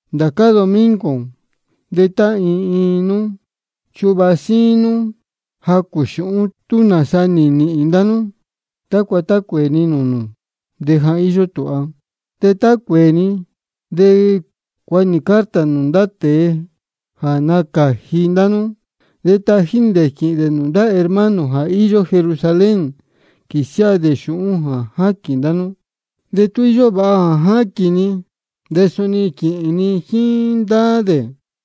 Ndācá domingo de tá iin iin nú chuvāha síín nú jacū xūhún, tú nāsa nī nīhīn ndá nú, tácua tá cuēē ni nūū nū de ja íyó tūha. De tá cuēē ni, de cuāha nī carta nūū ndá tēe jā nacāji ndá nú, de tají nī dē quīhīn dē nūū ndá hermano jā íyó Jerusalén, quīsiáha dē xūhún jā ní jaquīn ndá nú. De tú íyó vāha jā quīhīn ni, de suni quīhīn ni jíín ndá dē.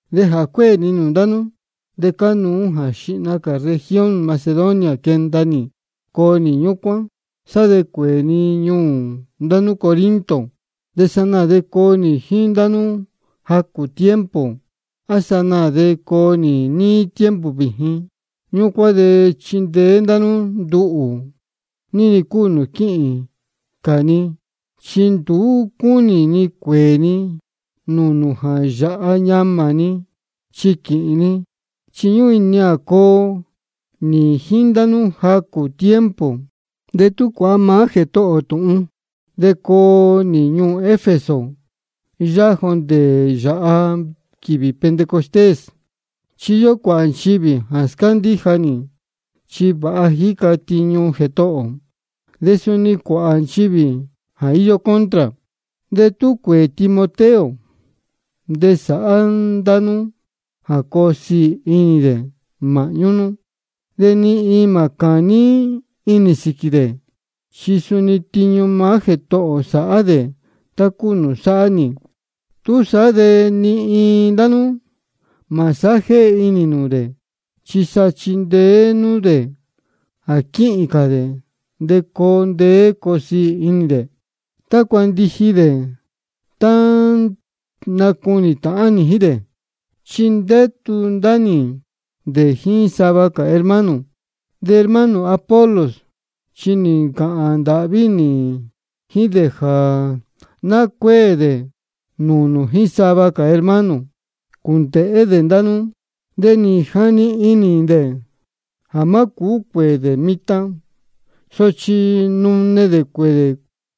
De jā cuéē ni nūū ndá nú, de cánuú jā xihna cā región Macedonia quenda nī coo nī ñúcuán, sá de cuēē ni ñuū ndá nú Corinto. De sanaā de coo nī jíín ndá nú jacū tiempo, á sanaā de coo ó níí tiempo vījin. Ñúcuán de cuu chindeé ndá nú nduhū, ní-ni cúu nūū quíhīn cā ni. Chi nduú cúnī ni cuēē ni nūū nū jā yāha ñamā ni quīhīn ni, chi ñúhún inī ni jā coo nī jíín ndá nú jacū tiempo, de tú cuāha maá Jētohō ō tūhun. De coo nī ñuū Efeso yáhá jondē yāha quīvī Pentecostés. Chi íyó cuāhā nchivī jā scándíja nī, chi vāha jíca tiñu Jētohō ō. De suni íyó cuāhā nchivī jā íyó contra. De tú cuēē Timoteo, de sāhá ndá nú jā coo siī inī dē māhñú nú, de ni iin mā cāní inī dē sīquī. Chi suni tiñu maá Jētohō ō sáhá dē, tá cúu nūū sáhá nī. Túsaá de ni iin ndá nú mā sájéhe inī nūū dē. Chi sa chindeé nú dē jā quíhīn cā dē, de coo ndeé coo siī inī dē, tácua ndiji dē jā nacunī tāhán nī jíín dē. Chi ndétu ndá nī dē jíín sava cā hermano. De hermano Apolos, chi nī ncāhān ndāhví nī jíín dē jā ná cuéē dē nūū nū jíín sava cā hermano, cuēndēhé dē ndá nú. De nī jani inī dē jā má cūú cuēē dē mitan. Sochi tá nune dē de cuēē dē.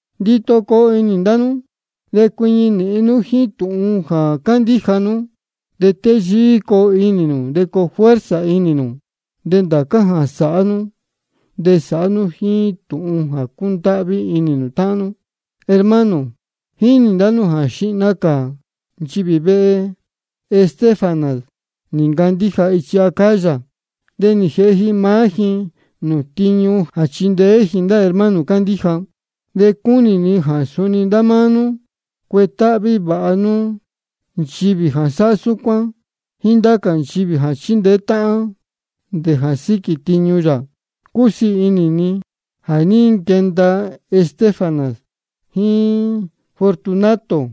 Ndito coo inī ndá nú, de cuiñi nīhin nú jíín tūhun jā cándíja nú. De téyíí coo inī nū, de coo fuerza inī nū. De ndācá jā sáhá nú, de sāhá nú jíín tūhun jā cúndáhví inī táhán. Hermano, jínī ndá nú jā xihna cā nchivī vehe Estéfanas nī ncandíja ichi Acaya. De nī jēhe ji maá ji nūū tiñu jā chindeé ji ndá hermano cándíja. De cúnī ni jā suni ndá máá nú cuetáhví vāha nú nchivī jā sáhá súcuán, jíín ndá cā nchivī jā chíndeé táhán de sátíñú sīquī tiñu yā. Cúsiī inī ni jā ní nquenda Estéfanas jíín Fortunato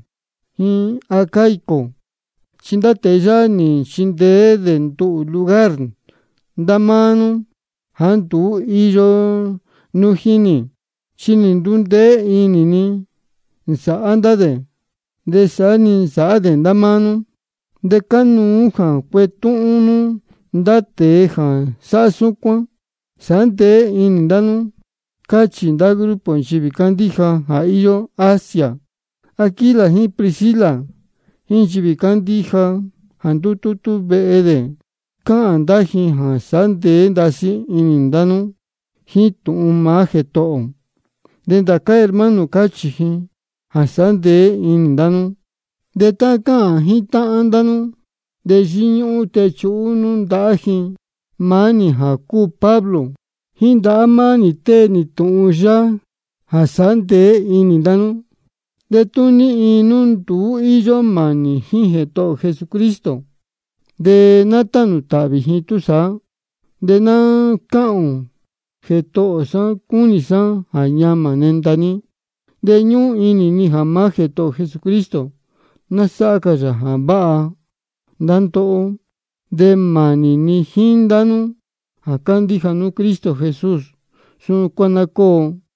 jíín Acaico, chi ndá tēe yáhá nī nchindeé dē nduhū lugar ndá máá nú jāá nduú ní íyo nú jíín nī. Chi nī ndundeé inī ni nī nsāhá ndá dē, de saá-ni nī nsāhá dē ndá máá nú. De cánuú jā cuetúhún nú ndá tēe jā sáhá súcuán. Sāhá ndeé inī ndá nú, cáchī ndá grupo nchivī cándíja jā íyó Asia. Aquila jíín Priscila jíín nchivī cándíja jā ndútútú vehe dē, cáhān ndá ji jā sāhá ndeé ndasí inī ndá nú jíín tūhun maá Jētohō ō. De ndācá hermano cáchī ji jā sāhá ndeé inī nū. De tá cáhān jítáhán ndá nú, de yíñúhún techuhú nú ndahá ji. Maá nī jā cúu Pablo, jíín ndahá maá nī tée nī tūhun yáhá jā sāhá ndeé inī ndá nú. De tú ní iin nduú íyó mānī jíín Jētohō ō Jesucristo, de ná tánū tāhvī ji túsaá. De ná cáhān ō: Jētohō sá, cúnī sá jā ñamā nenda ní. De ñúhún inī ni jā maá Jētohō ō Jesucristo, ná sáhá cā yā jā váha ndá ndóhó. De mānī ni jíín ndá nú jā cándíja nú Cristo Jesús. Súcuán ná cóo. Amén.